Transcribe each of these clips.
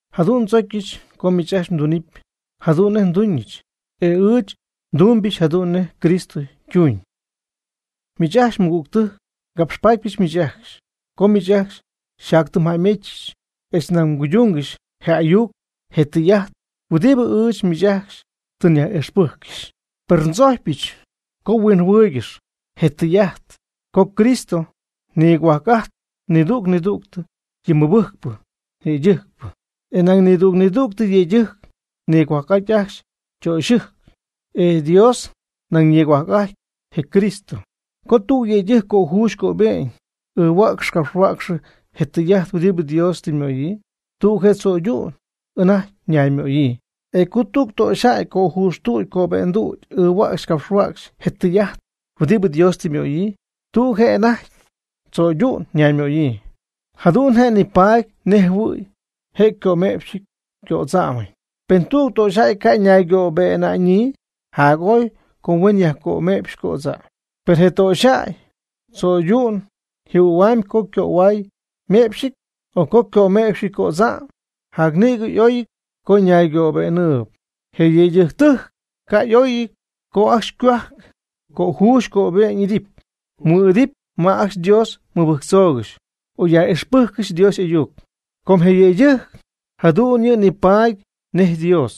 Jadu'n ndzocyɨch co miich ajcxy mdunɨpy jadu'n nej nduñɨch. E ɨɨch tumbɨch jadu'n nej Cristo ytuuñ. Miich ajcxy mɨgügtɨjc, ngapxpatypɨch miich ajcxy, com miich ajcxy xyjatytɨmyjäymejtzpɨch, etz nañ mguydungɨxyp je ayuc je tɨy'ajt huɨdibɨ ɨɨch miich ajcxy tɨ nyaj'ixpɨjccɨxy. Per ndzojcypɨch co mhuinjɨhuɨ́ɨygɨxɨpy je tɨy'ajt co Cristo nigohuajc'ajtpy nidüg nidüg yɨ mɨbɨjcpɨ yëydɨjcpɨ. E nañ nidüg nidüg yëydɨjc nigohuajc'ajty ajcxy ytöxyɨjc. E Dios nañ nigohuajc'ajtpy je Cristo. Co tüg yëydɨjc cöjuuxy cöbe'ñ ɨɨhuäcxy capxhuäcxy je tɨy'ajt huɨdibɨ Dios tɨ ymöyii, tüg je' tzo'ydu'ñ anajty naymöyii. E co tüg töxyjäy cöjuxtüdy cöbe'ndüdy ɨɨhuäcxy capxhuäcxy je tɨy'ajt huɨdibɨ Dios tɨ ymöyii, tüg je' anajty tzo'ydu'n ñaymöyii. Jadu'n je' nipaady nej jɨhuɨ̈y je' ycöme'pxɨty cödza'm. Pen tüg töxyjäy ca' ñaygöbe'na'ñyii, jac'oy co huen yajcöme'pxy cödza'm. Per pen je töxyjäy cho'ydu'n jɨhuɨ̈huamyb co ycöhuay yme'pxɨty, o co ycöme'pxɨty cödza'm, jac nïgɨ oy co ñaygöbe'nɨɨyb. Je yëydɨjctɨjc ca' y'oyɨty co ajcxy ycohuajc cöjuuxy cöbe'ñ mɨ'idɨpy ma ajcxy Dios mɨbɨjtzoogɨxy o yaj'ixpɨjccɨxy Dios y'ayuc. Com je yëydɨjc jadu'n yɨ' nipaady nej Dios,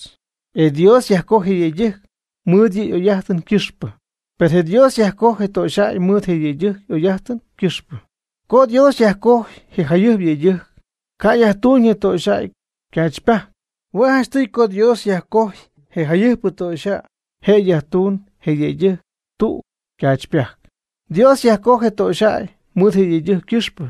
e Dios yajcoj je yëydɨjc mɨɨd yɨ' y'oy'ajtɨn ycɨxpɨ. Per Dios yajcoj je töxyjäy mɨɨd je yëydɨjc y'oy'ajtɨn ycɨxpɨ. Co Dios yajcojy je jayɨjpɨ yëydɨjc, ca' yajtuuñ je töxyjäy ycaachypajc. Hue' janchtɨy co Dios yajcojy je jayɨjpɨ töxyjäy, je' yajtuunɨ je ñiyëydɨjc tüg ycaachypajc. Dios yajcoj je töxyjäy mɨɨd je yëydɨjc ycɨxpɨ.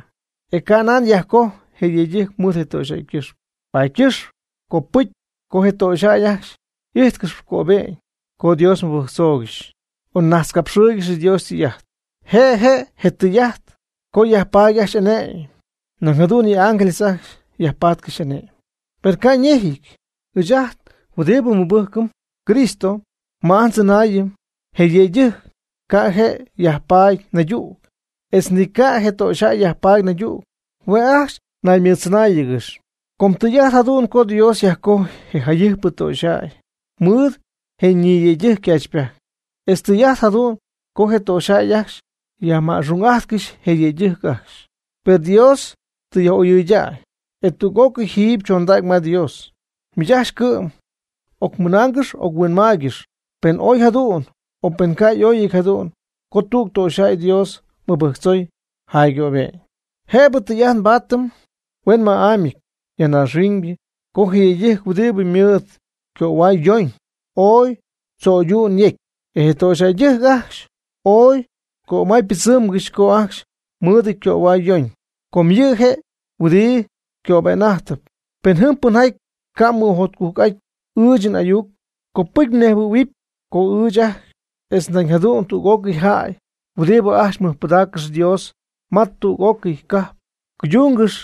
E ca' nan yajcojy je yëydɨjc mɨɨd je töxyjäy ycɨxpɨ. Paady ycɨxp copɨcy co je töxyjäy ajcxy y'ijtcɨxy cöbe'ñ co Dios mɨbɨjctzoogɨxy o najtzcapxɨɨygɨxy Dios ytɨy'ajt. Je' je' je tɨy'ajt co yajpaady ajcxy ane'my, nañ jadu'n yɨ ángeles ajcxy yajpaatcɨxy ane'my. Per ca' ñejɨty, ɨɨch ajt huɨdibɨ nmɨbɨjcɨm Cristo, ma ajt ndzɨnaayɨn je yëydɨjc ca' je' yajpaady naydüg, etz ni ca' je töxyjäy yajpaady naydüg, hue' ajcxy naymɨɨddzɨnáayɨgɨxyp. Com tɨy'ajt jadu'n co Dios yajcojy je jayɨjpɨ töxyjäy mɨɨd je ñiyëydɨjc ycaachypajc. Etz tɨy'ajt jadu'n co je töxyjäy ajcxy yajma'xung'ajtcɨxy je yëydɨjc ajcxy. Per Dios tɨ yaj'oyɨydäy, e tüg'ócɨy jiiby chondäy ma Dios. Miich ajcxy cɨ'm ocmɨnaangɨx oc-huinmaaygɨx, pen oy jadu'n o pen ca' y'oyɨty jadu'n co tüg töxyjäy Dios mɨbɨjctzoy jaygöbe'ñ. Jëbɨ tɨy'ajt nbaatɨm huenma'ámyɨty ya naaxhuiñ co je yëydɨjc huɨdibɨ ymɨɨd ycöhuay yoñ ooy cho'ydu'n yecy. E je töxyjäydɨjc ajcxy ooy ycömaypɨdzɨmgɨxy co ajcxy mɨɨdɨty ycöhuay yoñ. Com yɨ' je' huɨdi ycöbe'n'ajtɨp. Pen jɨm pɨnjaty ca' mɨjotcujc'aty ɨɨch n'ayuc, copɨcy nejhuɨ̈huɨpy co ɨɨch ajcxy etz nañ jadu'n tüg'ócɨy jäy huɨdibɨ ajcxy mɨjpɨdaaccɨxyp Dios ma tüg'ócɨy cajp, cuydungɨxy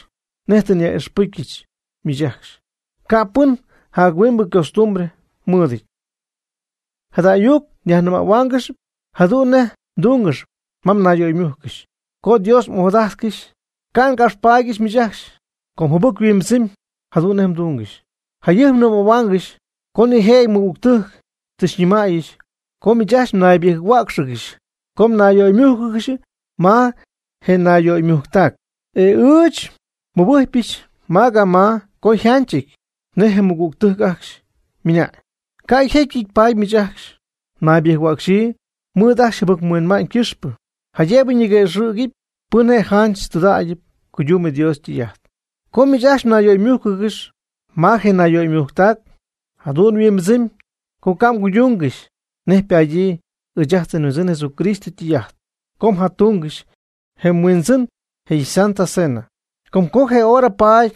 nej tɨ nyaj'ixpɨcyɨch miich ajcxy, ca' pɨn jac huingbɨ costumbre mɨɨdɨty. Jada ayuc nyajnɨmähuaangɨxyp jadu'n nej mdungɨxy ma mnayyöymújcɨgɨxy co Dios m'ojadajtcɨxy. Ca' ngapxpaadyɨch miich ajcxy, com jɨbɨc yhuimbɨdzɨmy jadu'n nej mdungɨxy. Jayɨjp nɨmähuaangɨxy co nijëjɨty mɨgügtɨjc tɨ xyñɨmäyɨch co miich ajcxy mnaybɨjc-huäcxɨgɨxy co mnayyöymújcɨgɨxy ma je nayyöymujctac. E ɨɨch nmɨbɨjcpyɨch ma ga ma co yjanchɨty nej je mɨgügtɨjc ajcxy ymɨna'ñ. Ca' yjecyɨty paady miich ajcxy mnaybɨjc-huäcxɨ mɨɨd ajcxy mjɨbɨc-huinma'ñ ycɨxpɨ, jaydëbɨ ñiguëxɨ̈gy pɨn je' janch tɨydudägy cuydumb Dios ytɨy'ajt. Co miich ajcxy mnayyöymújcɨgɨxy ma je nayyöymujctac, jadu'n yhuimbɨdzɨmy co ca' mguydungɨxy nej ypadyii ɨɨch ajt nHuindzɨn Jesucristo ytɨy'ajt co mjatungɨxy je “Huindzɨn je' ySanta Cena”. Com co je hora paady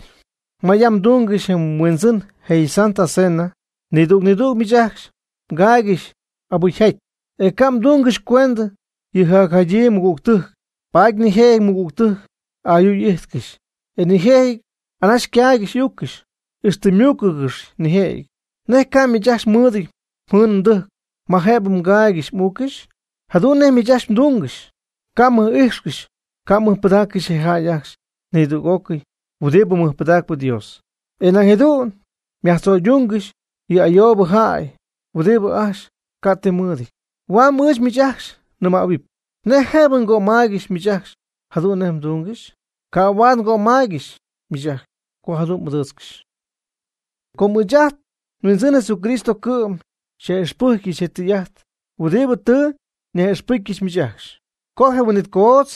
ma yam mdungɨxy je “Huindzɨn je' ySanta Cena” nidüg nidüg miich ajcxy mgaaygɨxy abɨcyjaty, e ca' mdungɨx cuendɨ yɨ jacjadyii mɨgügtɨjc, paady nijëjɨty mɨgügtɨjc ayuu y'ijtcɨxy, e nijëjɨty anaxy ycaaygɨxy y'uuccɨxy, ixtɨ ymuucɨgɨxy nijëjɨty. ¿Nej ca' miich ajcxy mɨɨdɨty mjɨɨn mdɨjc ma jëbɨ mgaaygɨxy m'uuccɨxy? Jadu'n nej miich ajcxy mdungɨxy ca' mmɨj'ijxcɨxy ca' mɨjpɨdaaccɨxy je jäy ajcxy nidüg'ócɨy huɨdibɨ mɨjpɨdacp Dios. E nañ jadu'n myajtzo'ydungɨxy yɨ ayoobɨ jäy huɨdibɨ ajcxy ca' ti mɨɨdɨty. ¿Huam ɨɨch miich ajcxy nɨmähuɨpy? ¿Nej jëbɨ ngömaaygɨxy miich ajcxy jadu'n nej mdungɨxy? Ca' huaad ngömaaygɨxy miich ajcxy co jadu'n m'ɨdɨɨtzcɨxy. Com ɨɨch ajt nHuɨndzin Jesucristo cɨ'm xyaj'ixpɨjcyɨch je tɨy'ajt huɨdibɨ tɨ nyaj'ixpɨcyɨch miich ajcxy, co je huin'it coodz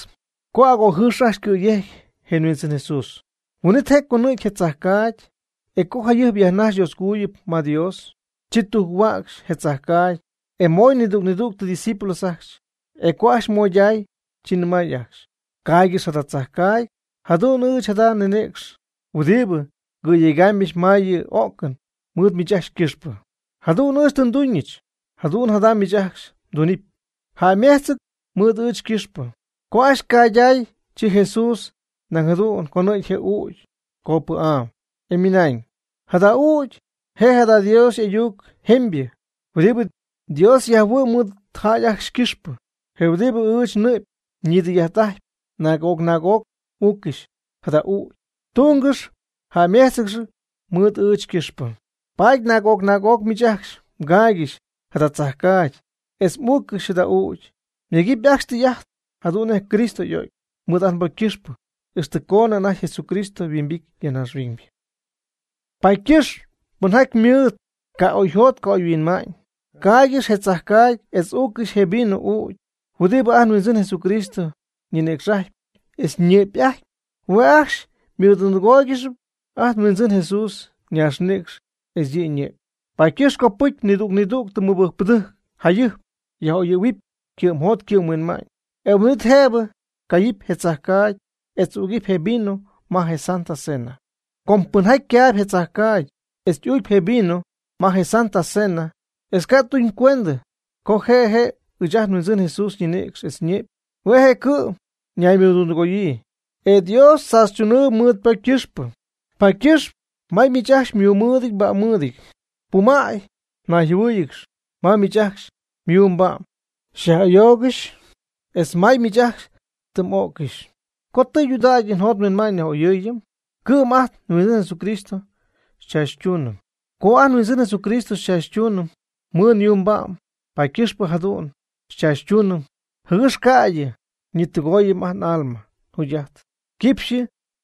co agojɨɨx ajcxy cɨ̈yejcy je nHuindzɨn Jesús, huin'it je' conɨ̈gy je tzajcaagy, e co jayɨjp yajnajxy Dioscojuyip ma Dios, chi tujc-huäcxy je tzajcaagy, e moy nidüg nidüg ydiscípulos ajcxy. E co ajcxy moyday, chi nɨmay ajcxy: “Caaygɨx jada tzajcaagy. Jadu'n ɨɨch jada nninïcx huɨdibɨ ngɨ̈yegaamybɨch ma yɨ o'cɨn mɨɨd miich ajcxy ycɨxpɨ. Jadu'n ɨɨch tɨ nduñɨch, jadu'n jada miich ajcxy mdunɨpy jäymejtzɨɨg mɨɨd ɨɨch ycɨxpɨ.” Co ajcxy ycayday, chi Jesús nañ jadu'n conɨ̈gy je ügy copɨ'am, e ymɨnañ: “Jada ügy je' jada je Dios y'ayuc jemybɨ huɨdibɨ Dios yajhuɨ'my mɨɨd jäy ajcxy ycɨxpɨ, je huɨdibɨ ɨɨch nnɨ'py ñidɨy'ajt'ajtpy. Naag'oc naag'oc m'uuccɨxy jada ügy tungɨxy jäymejtzɨɨg mɨɨd ɨɨch ycɨxpɨ.” Paady naag'oc naag'oc miich ajcxy mgaaygɨxy jada tzajcaagy, etz m'uuccɨxy jada ügy, myegɨpy ajcxy tɨy'ajt jadu'n nej Cristo y'o'cy mɨɨd ajt nbocy ycɨxpɨ, ixtɨ coonɨ anajty Jesucristo yhuimbity ya naaxhuiñ. Paady ycɨxp pɨnjaty mɨɨd ca'oyjot ca'oyhuinma'ñ caaygɨxy je tzajcaagy etz uuccɨxy je vino'ügy, huɨdibɨ ajt nHuindzɨn Jesús ñinïcx'ajtpy etz ñɨ'py'ajtpy, hue' ajcxy ymɨdundɨgooygɨxy ajt nHuindzɨn Jesús ñaaxnïcx etz yɨ' yñɨ'py. Paady ycɨxpɨ copɨcy nidüg nidüg mɨbɨjcpɨdɨjc jayɨjp yaj'oyɨ̈huɨpy ycɨ'mjot ycɨ'mhuinma'ñ, e huin'it jëbɨ cayɨpy je tzajcaagy etz ügɨpy je vino ma je “Santa Cena”. Com pɨnjaty caayb je tzajcaagy etz ügy je vino ma je “Santa Cena”, e ca' tuñ cuendɨ co je' je' ɨɨch ajt nHuindzɨn Jesús ñinïcx etz ñɨ'py, hue' je' cɨ'm ñaymɨdundɨgoyii, e Dios tzaachytunɨɨb mɨɨd ypocy ycɨxpɨ. Paady ycɨxp may miich ajcxy myuumɨɨdɨty mba'mmɨɨdɨty, pumäy mnayjɨhuɨɨyɨgɨxy. May miich ajcxy yuu ba'm xyaj'ayoogɨxy etz may ma miich ajcxy tɨ m'öccɨxy. Co tɨydudägy njot nhuinma'ñ nyaj'oyɨɨyɨm cɨ'm, ca' ajt nHuindzɨn Jesucristo xychaachytuunɨm. Co ajt nHuindzɨn Jesucristo xychaachytunɨm mɨɨd yuu ba'm, paady ycɨxpɨ jadu'n xychaachytuunɨm, jɨgɨx ca'ydɨ nidɨgooyɨm ajt n'alma yjugy'ajtɨn quipxyɨ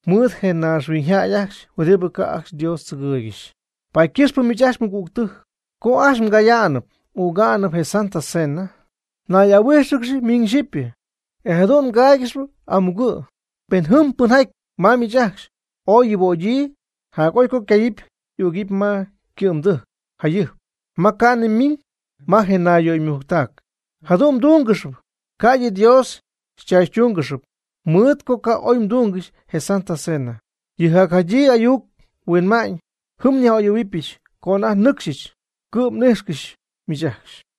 mɨɨd je naaxhuiñyjäy ajcxy huɨdibɨ ca' ajcxy Dios tzɨgɨɨygɨxy. Paady ycɨxpɨ miich ajcxy mɨgügtɨjc co ajcxy mgaya'nɨp m'üga'nɨp je “Santa Cena” nay'ahuíjxɨgɨxy miñ xyipy, e jadu'n mgáaygɨxɨpy amugɨ'. Pen jɨm pɨnjaty ma miich ajcxy ooy yuubögyii, jac'oy co ycaayɨpy y'ügɨpy ma ycɨ'mdɨjc jacjayɨjp ma ca'nɨ ymiñ ma je nayyöymujctac. Jadu'n mdúngɨxɨpy, ca'ydɨ Dios xychaachytuungɨxy mɨɨd co ca' oy mduungɨxy je “Santa Cena”. Yɨ jacjadyii ayuc huinma'ñ jɨm nyaj'oyɨ̈huɨbɨch co anajty nɨcxy cɨ'm n'íjxcɨxyɨch miich ajcxy.